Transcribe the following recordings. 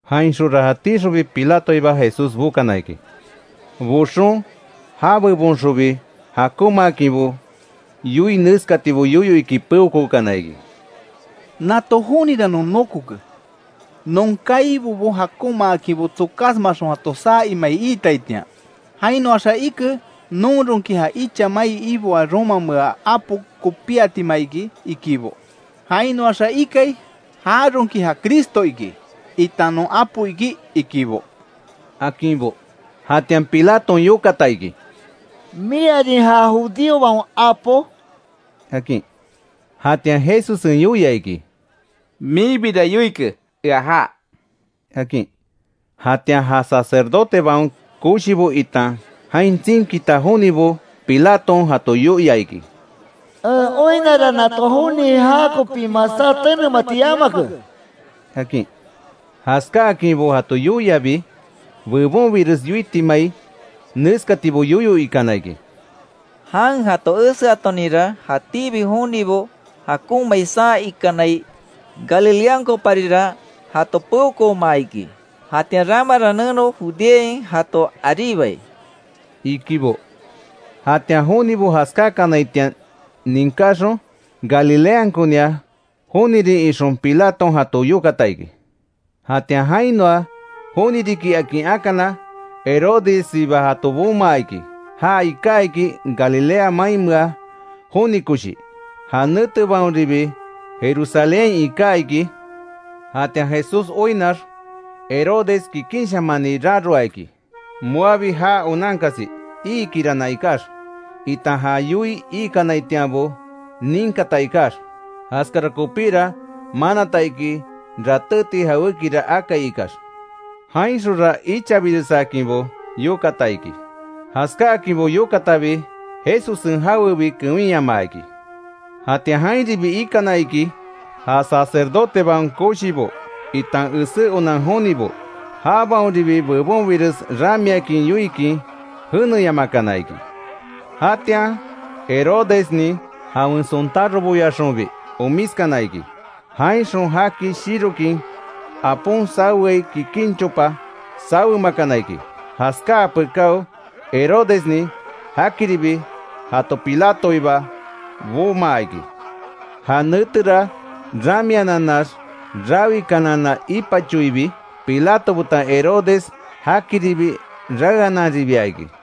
Jainxonra jatíxonbi Pilatoiba Jesús bokana iki. Boxon já bebonxonbi jakonmaakinbo yoii, neskatibo yoyo iki peokookana iki: —Nato jonira non nokoke, non kaibobo jakonmaakinbo tsokásmaxon jato saa imai iitaitian. Jainoaxa ike, non ronki ja icha mai iboaa romamea apo kopíatima iki ikibo, jainoaxa ikai, jaronki ja Cristo iki, itan non apo iki ikibo —akinbo. Jatian Pilaton yokata iki: —¿Miarin ja judíobaon apo? —akin. Jatian Jesussen yoia iki: —Minbira yoike ea já —akin. Jatian ja sacerdotebaon koshibo itan jain tsinkita jonibo Pilaton jato yoia iki: —En oinnara nato joni jakopi masá tenemati yamake —akin. Jaskáakinbo jato yoiabi bebonbires yoitimai, neskatibo yoyo ikana iki: —Jan jato eseatoninra jatíbi jonibo jakonmai saa ikanai; Galileankoparira jato peokoomaa iki; jatian ramara neno Judeain jato aríbai —ikibo. Jatian jonibo jaskákanaitian ninkáxon, Galileankonia jonirin ixon Pilaton jato yokata iki. Jatian jainoa joni riki akin akana, Herodessiba jato bomaa iki. Ja iká iki Galilea mainmea joni koshi; ja netebaonribi Jerusalénhain iká iki. Jatian Jesús oinnax Herodes kikinshamani raroa iki, moabi já onankasi iikirana ikax, itan já yoii ikanaitianbo ninkata ikax. Jaskara kopíra manata iki, ratéti jawékira akai ikax. Jainxonra ichabiresakinbo yokata iki; jaskáakinbo yokatabi, Jesussen jawebi kewinyamaa iki. Jatian jainribi ikana iki, ja sacerdotebaon koshibo itan esé onan jonibo. Jabaonribi bebonbires ramiakin yoikin jeneyamakana iki. Jatian Herodesnin jawen sontároboyaxonbi omiskana iki. Jainxon jaki shirokin apon saweai kikin chopa sawemakana iki. Jaskáa pekáo Herodesnin jakiribi jato Pilatoiba bomaa iki. Ja netera ramiananax rawikanana ipachoibi, Pilato betan Herodes jakiribi raeananribia iki.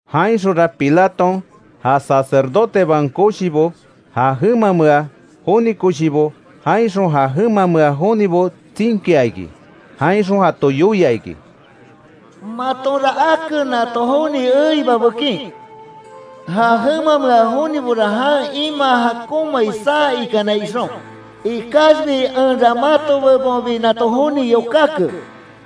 Jainxonra Pilaton ja sacerdotebaon koshibo, ja jemamea joni koshibo, jainxon ja jemamea jonibo tsinkia iki. Jainxon jato yoia iki: —Matonra ake nato joni eiba bekin; ja jemamea jonibora jan imaa jakonmai saa ikanai ixon. Ikaxbi enra mato bebonbi nato joni yokáke.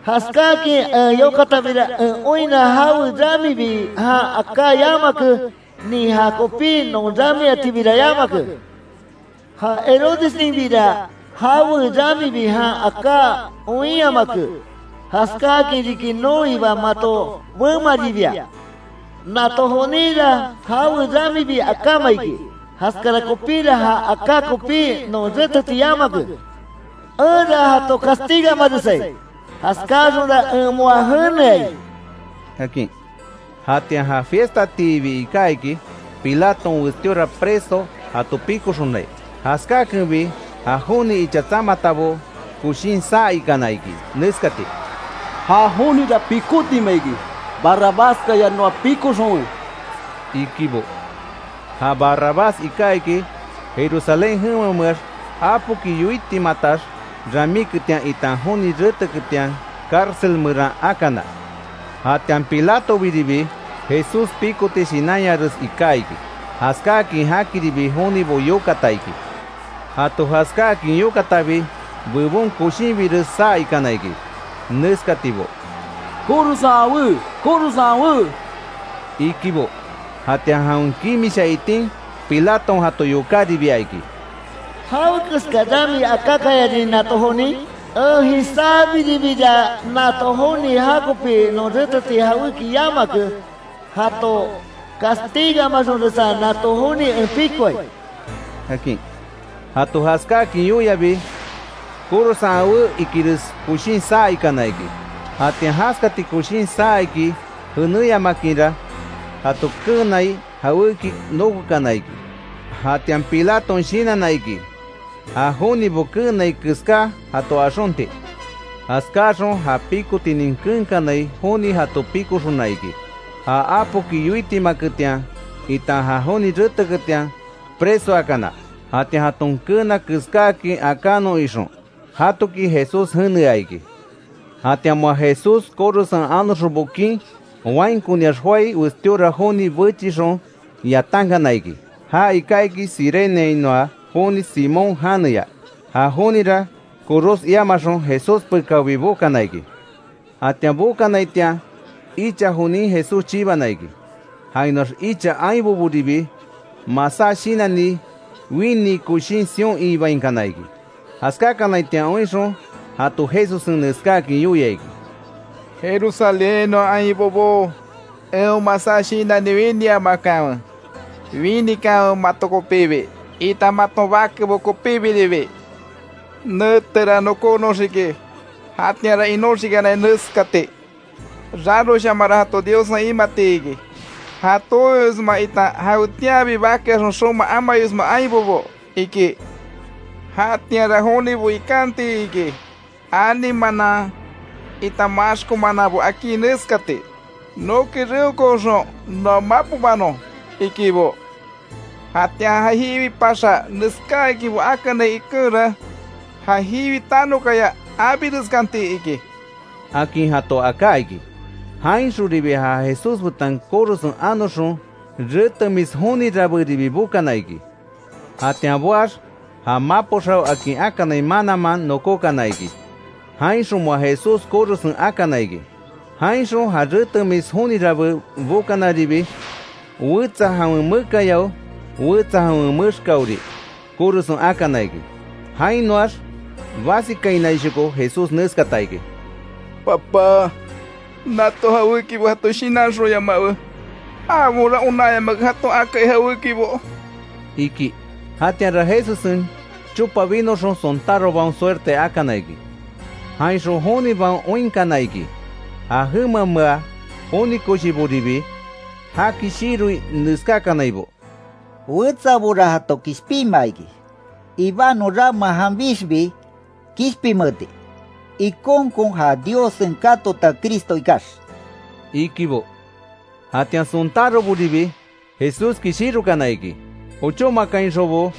Jaskáakin en yokatabira, en oinna jawe ramibi jan aká yamake, nin jakopí non ramiatibira yamake. Ja Herodesninbira jawe ramibi jan aká oinyamake; jaskáakin riki noiba mato bemaribia. Nato joninra jawe ramibi akáma iki. Jaskara kopíra, ja aká kopí non réteti yamake. Enra jato castigamaresai; jaskáaxonra en moa jeneai —akin. Jatian ja fiestatiibi iká iki, Pilaton westíora preso jato pikoxonai. Jaskákenbi, ja joni icha tsamatabo koshin saa ikana iki, neskati: —¡Ja jonira pikotima iki! ¡Barrabaskaya noa pikoxonwe! —ikibo. Ja Barrabás iká iki; Jerusalén jemameax apoki yoitimatax ramíketian itan joni reteketian cárcel meran akana. Jatian Pilatobiribi, Jesús pikoti shinanyares iká iki, jaskákin jakiribi jonibo yokata iki. Jato jaskáakin yokatabi; bebon koshinbires saa ikana iki, neskatibo: —¡Korosen awé! ¡Korosen awé! —ikibo. Jatian jawen kimisha itin Pilaton jato yokáribia iki: —¿Jawekeska rami akákayarin nato jonin? En jisábiribira, nato joni jakopi non reteti jawéki yamake. Jato castigamaxonresa nato joni en pikoai —akin. Jato jaskáakin yoiabi, korosen awé ikires koshin saa ikana iki. Jatian jaskati koshin saa iki jenéyamakinra, jato keenai jawéki nokokana iki. Jatian Pilaton shinanna iki, ja jonibo keenai keská jato axonti. Jaskáaxon ja pikotinin keenkanai joni jato pikoxona iki. Ja apoki yoitimaketian itan joni reteketian presoakana. Jatian jaton keena keskáakin akanon ixon, jatoki Jesús jenea iki. Jatian moa Jesús korosen anoxon bokin, wainkoniax joái westíora joni bechixon yatankana iki. Ja iká iki Cireneainoa joni Simón janeya. Ja jonira koros iamaxon, Jesús pekaobi bokana iki. Jatian bokanaitian, icha jonin Jesús chibana iki. Jainoax icha ainboboribi masá shinanni winii koshin sion iibainkana iki. Jaskákanaitian oinxon jato Jesussen neskáakin yoia iki: —Jerusalénhainoa ainbobó, eon masá shinanni winiamakanwe. Winikanwe mato kopibi, itan maton bakebo kopíbiribi. Netera nokónoxiki, jatianra inoxikanai neskati: ‘Raroshamanra jato Diossen imati iki, ja tooisma itan, jawetianbi bakeaxon xoma amayosma ainbobo’ iki. Jatianra jonibo ikanti iki, ani manan itan maxko mananbo akí neskati: ‘¡Noki reokooxon noa mapobanon!’ ikibo. Jatian ja jiwi paxa neskáakinbo akanai ikenra, ja jiwi tanokaya abireskanti iki —akin jato aká iki. Jainxonribi ja Jesús betan korosen anoxon, retemis joni rabéribi bokana iki. Jatian boax, ja mapo xao akin akanai mananman, nokókana iki, jainxon moa Jesús korosen akana iki. Jainxon ja retemis joni rabé bokanaribi, wetsa jawen mekayao wetsa jawen mexkaori korosen akana iki. Jainoax basikainaishoko Jesús neskata iki: “Papá, nato jawéki jato shinanxonyamawe, jabaonra onanyamake jaton akai jawékibo”, iki. Jatianra Jesussen chopa binoxon, sontárobaon suerte akana iki. Jainxon jonibaon oinkana iki, ja jemamea joni koshiboribi jaki shiroi neskákanaibo: —Wetsabora jato kishpinmaa iki, ibanon rama janbixbi kishpinmeeti; ikonkon ja Diossen katota Cristo ikax —ikibo. Jatian sontároboribi Jesúski shirokana iki. Ochómakainxonbo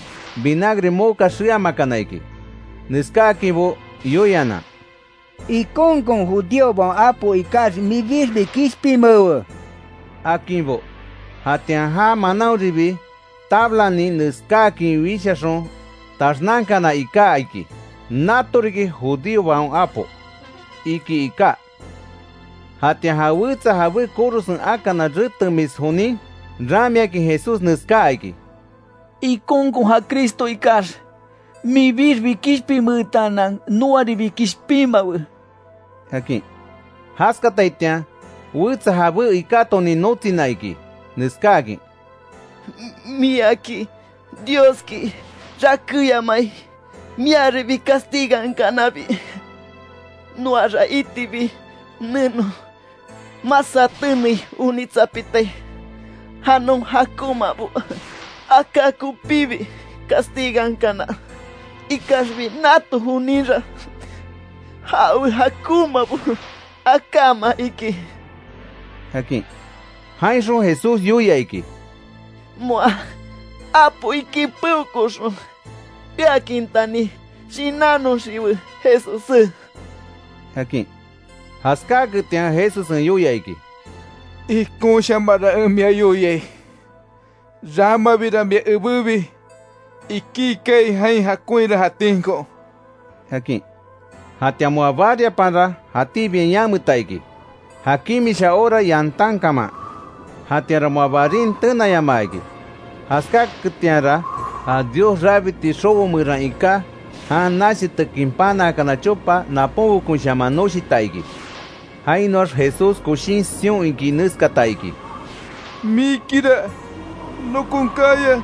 vinagre moka xeamakana iki. Neskáakinbo yoianan: —¡Ikonkon judíobaon apo ikax minbixbi kishpinmeewe! —akinbo. Jatian já manaonribi, tablanin neskáakin wishaxon taxnankana iká iki: “Nato riki judíobaon Apo”, iki iká. Jatian ja wetsa jabé korosen akana retemis jonin, ramiakin Jesús neskáa iki: —¡Ikonkon ja Cristo ikax, minbixbi kishpinmeetaanan noaribi kishpinmawe! —akin. Jaskataitian wetsa jabé ikátonin notsina iki, neskáakin: —¿Miaki Dioski rakéyamai, miaribi castigankanabi? Noara itibi neno masá tenei onitsapitai, ja non jakonmabo aká kopíbi castigankana. Ikaxbi nato joninra jawe jakonmabo akáma iki —akin. Jainxon Jesús yoia iki: —Moa apo iki peokooxon eaakintani shinannoxiwe, Jesussé —akin. Jaskáaketian Jesussen yoia iki: —Ikonshamanra en mia yoiai, ramabira mia ebébi ikí kaai, jain jakonhira jatínko —akin. Jatian moa bariapanra, jatíbiain yameta iki, ja kimisha hora yantan kaman. Jatianra moa barin tenayamaa iki; jaskáketianra, ja Dios rabiti xobo meran iká, jan nachitekin panaa chopa naponbekonshaman noshita iki. Jainoax Jesús koshin sion iki neskata iki: —¡Mikira nokon kaya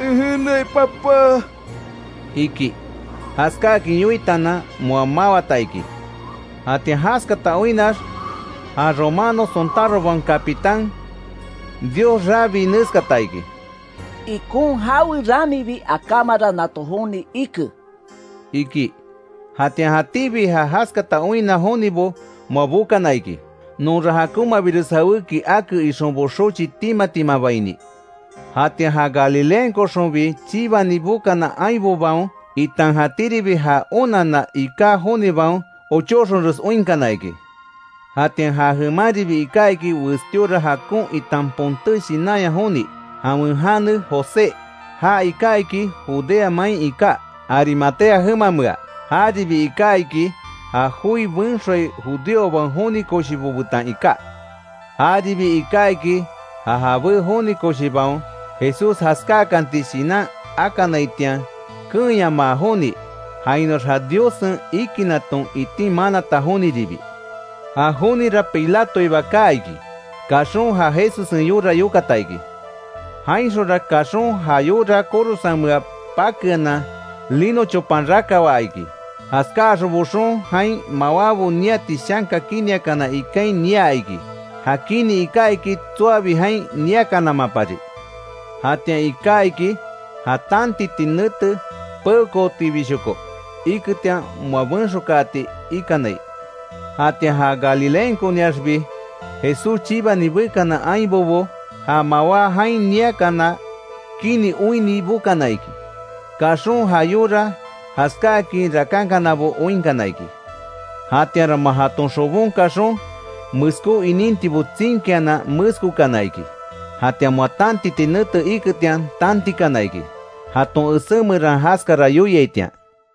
en jeneai Papá! —iki. Jaskáakin yoitaanan moa mawata iki. Jatian jaskata oinnax ja romano sontárobaon capitán, Dios rabii neskata iki: —Ikon jawe ramibi akámara nato joni ike —iki. Jatian jatíbi ja jaskata oinna jonibo moa bokana iki; nonra jakonmabires jawéki ake ixonbo xochi tima timabaini. Jatian ja Galileankoxonbi chibani bokana ainbobaon, itan jatíribi já onanna iká jonibaon, ochóxonres oinkana iki. Jatian ja jemanribi iká iki westíora jakon itan ponté shinanya joni; jawen jane José. Ja iká iki Judea main iká, Arimatea jemamea. Jaribi iká iki, ja joi benxoai judíobaon joni koshibo betan iká. Jaribi iká iki, ja jabé joni koshibaon, Jesús jaskáakanti shinan akanaitian keenyamaa joni. Jainoax ja Diossen ikinaton itin manata joniribi. Ja jonira Pilatoiba kaa iki; kaxon ja Jesussen yora yokata iki. Jainxonra kaxon ja yora korosenmea pakeanan lino chopan rakawaa iki. Jaskáaxon boxon jain mawábo niati shanka kiniakana ikain niaa iki. Ja kini iká iki, tsoabi jain niakanamapari. Jatian iká iki ja tantiti nete peokootibishoko iketian moa benxokaati ikanai. Jatian ja Galileankoniaxbi Jesús chibani bekana ainbobo, ja mawá jain niakana kini oinni bokana iki. Kaxon ja yora jaskáakin rakankanabo oinkana iki. Jatianra moa jaton xobon kaxon, meskó inintibo tsinkianan, meskokana iki. Jatian moa tantiti nete iketian, tantikana iki, jaton esé meran jaskara yoiaitian.